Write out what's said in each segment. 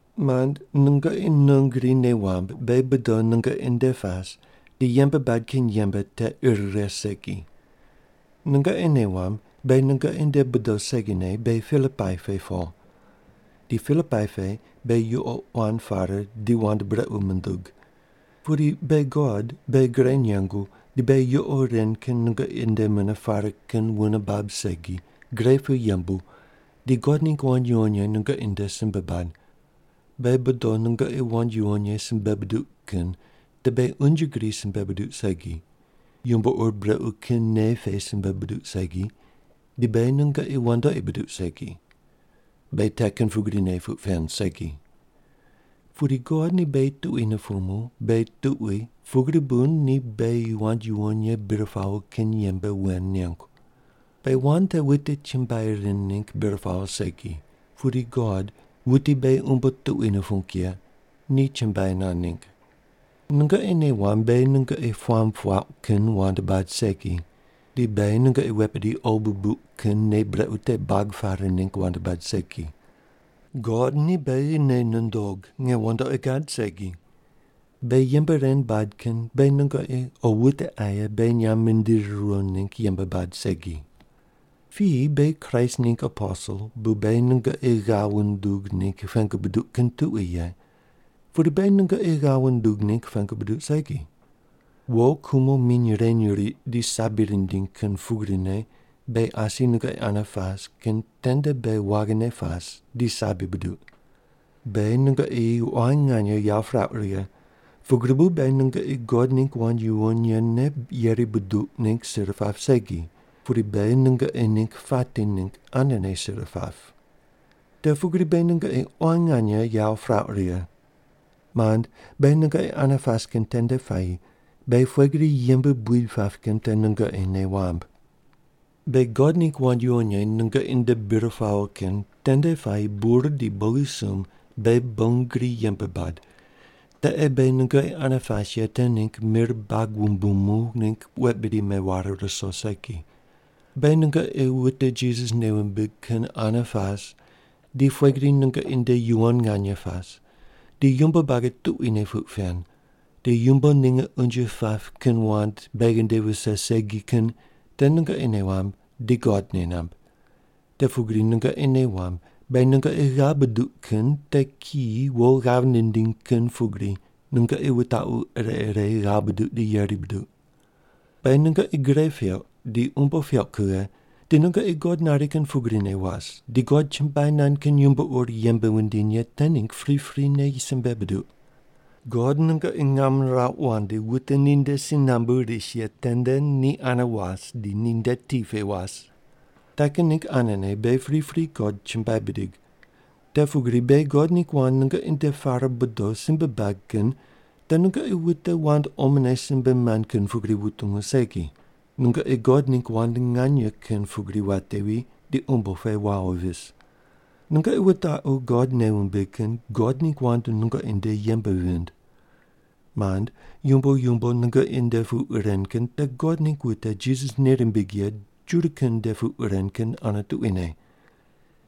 Mand, nungoqi non gri nei wamb beghi bodo nungoqi nde pas di yembe bad kin yembe te ir righe segi. Nungoqi nei wamb beghi nungoqi nde bodo segine beghi Pilipai pe po. Di Pilipai pe beghi yuqo quan pare di wand brequ mundug. Pudi beghi God beghi gre nengu di beghi yuqo ren kin nungoqi nde mune pare kin wune bab segi gre pu yembu di God ningg wand yuwon ye nungoqi nde simbe bad. Beghi bodo nungoqi wand yuwon ye simbe buduq kin te beghi unje gri simbe buduq segi, yumbo ur brequ kin nei pe simbe buduq segi, di beghi nungoqi wandoqi buduq segi. Beghi te kin pugrine puq pen segi. Pudi God ni beghi tuqui nupumu beghi tuqui pugri bu ni beghi wand yuwon ye bir pawo kin yembe wen nengu. Beghi wand te wute chumbuai rind ningg bir pawo segi, pudi God, wuti beghi umbo tuqui nupung ye, ni chumbuai nand ningg. Nungoqi nei wamb beghi nungoqi puamb puauq kin wand bad segi, di beghi nungoqi wet bidi qo bubuq kin nei brequ te buag pare ningg wand bad segi. God ni beghi nei nundog nge wandoqi gad segi. Beghi yembe ren bad kin beghi nungoqi o wute aye beghi nyamb mindiri riwo ningg yembe bad segi. Piyi beghi Kraist ningg aposel bu beghi nungoqi ghav wundug ningg pengu buduq kin tuqui ye, pudi beghi nungoqi ghav wundug ningg pengu buduq segi. Wo kumo miny reny riq di sabi rindiny kin pugrine beghi asi nungoqi ane pas kin tende beghi waghine pas di sabi buduq. Beghi nungoqi quan nganye yawo pirauq righe, pugri bu beghi nungoqi God ningg wand yuwon yene yeri buduq ningg sir pap segi, pudi beghi nungoqi ningg pati ningg anene sir pap. Te pugri beghi nungoqi quan nganye yawo pirauq righe. Mand, beghi nungoqi ane pas kin tende puayi beghi pughe gri yembe buid pap kin te nungoqi nei wamb. Beghi God ningg wand yuwon ye nungoqi nde bir pawo kin tende puayi bur di bogisumb beghi bon gri yembe bad, te ei beghi nungoqi ane pas ye te ningg mir bag wumbumu ningg wet bidi meware ruso segi. Beghi nungoqi wute Jisas nei wumbig kin ane pas di pughe gri nungoqi nde yuwon nganye pas, di yumbo buagi tuquine puq pen, di yumbo ninge unje pap kin wand beghi nde vise segi kin te nungoqi nei wamb di God nei namb. Te pugri nungoqi nei wamb beghi nungoqi ghav buduq kin te kiyi wo ghav nindiny kin pugri nungoqi wutaqu ire ire ghav buduq di yeri buduq. Beghi nungoqi gre peuq, di umbo peuq kughe, di nungoqi God nari kin pugrine was di God chumbuai nand kin yumbo ur yembe wundiny ye te ningg priprine simbe buduq. God nungoqi ngam nirauq wandi wute ninde si nambu ris ye tende ni ane was di ninde ti pe was. Te kin ningg anene beghi pripri God chumbuai bidig. Te pugri beghi God ningg wand nungoqi nde pare bodo simbe bad kin te nungoqi wute wand omone simbe mand kin pugri wutungu segi, nungoqi God ningg wand nganye kin pugri watevi di umbo pe wawo vis. Nungoqi wutaqu God nei wumbig kin God ningg wand nungoqi nde yembe vind. Mand, yumbo yumbo nungoqi nde puq ren kin te God ningg wute Jisas nei rimbig ye Juda kin nde puq ren kin ane tuquine.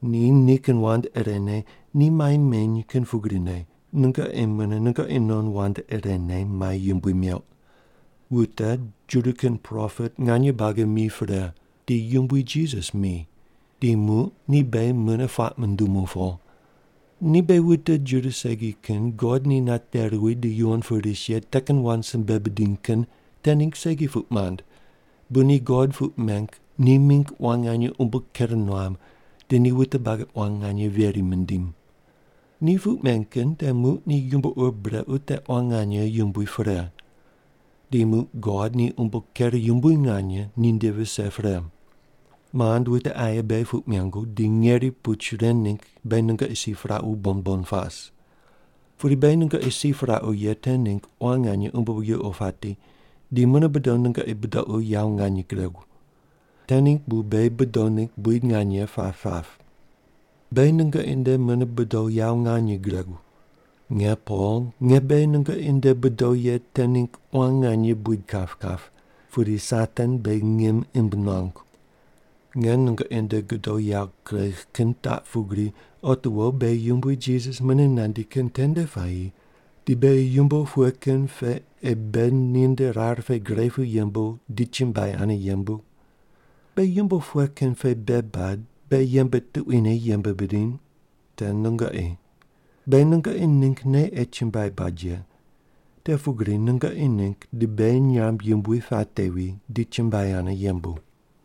Ni nikin wand irene ni mai meny kin pugrine nungoqi mune nungoqi non wand irene mai yumbui meuq. Wute Juda kin propet nganye buagi mi pre, di Yumbui Jisas mi, di muq ni beghi mune puaq mundumu po. Ni beghi wute Juda segi kin God ni nate ruwi di yuwon pu ris ye te kin wand simbe bidiny kin te ningg segi puq mand bu ni God puq meng ni mingg quan nganye umbo ker nuam di ni wute buagi quan nganye veri mindim. Ni puq men kin te muq ni yumbo ur brequ te quan nganye yumbui pre. Di muq God ni umbo ker yumbui nganye ninde vise pre. Mand, wute aye beghi puq mengu di ngeri puch ren ningg beghi nungoqi si piraqu bon bon pas. Pudi beghi nungoqi si piraqu ye te ningg quan nganye umbo yuqo pati di mune bodo nungoqi budoqu yawo nganye guregu. Te ningg bu beghi bodo ningg buid nganye pap pap. Beghi nungoqi nde mune bodo yawo nganye guregu. Nge Pol, nge beghi nungoqi nde bodo ye te ningg quan nganye buid kap kap, pudi Satan beghi ngim imb nuangu. Nge nungoqi nde godo yawo kuregh kin taq pugri otiwo beghi Yumbui Jisas mune nandi kin tende puayi di beghi yumbo pughe kin pe ei beghi ninde rar pe gre pu yembu di chumbuai ane yembu? Beghi yumbo pughe kin pe bei bad beghi yembe tuquine yembe bidiny? Te nungoqi. Beghi nungoqi ninggne ei chumbuai bad ye. Te pugri nungoqi ningg di beghi nyamb yumbui patevi di chumbuai ane yembu.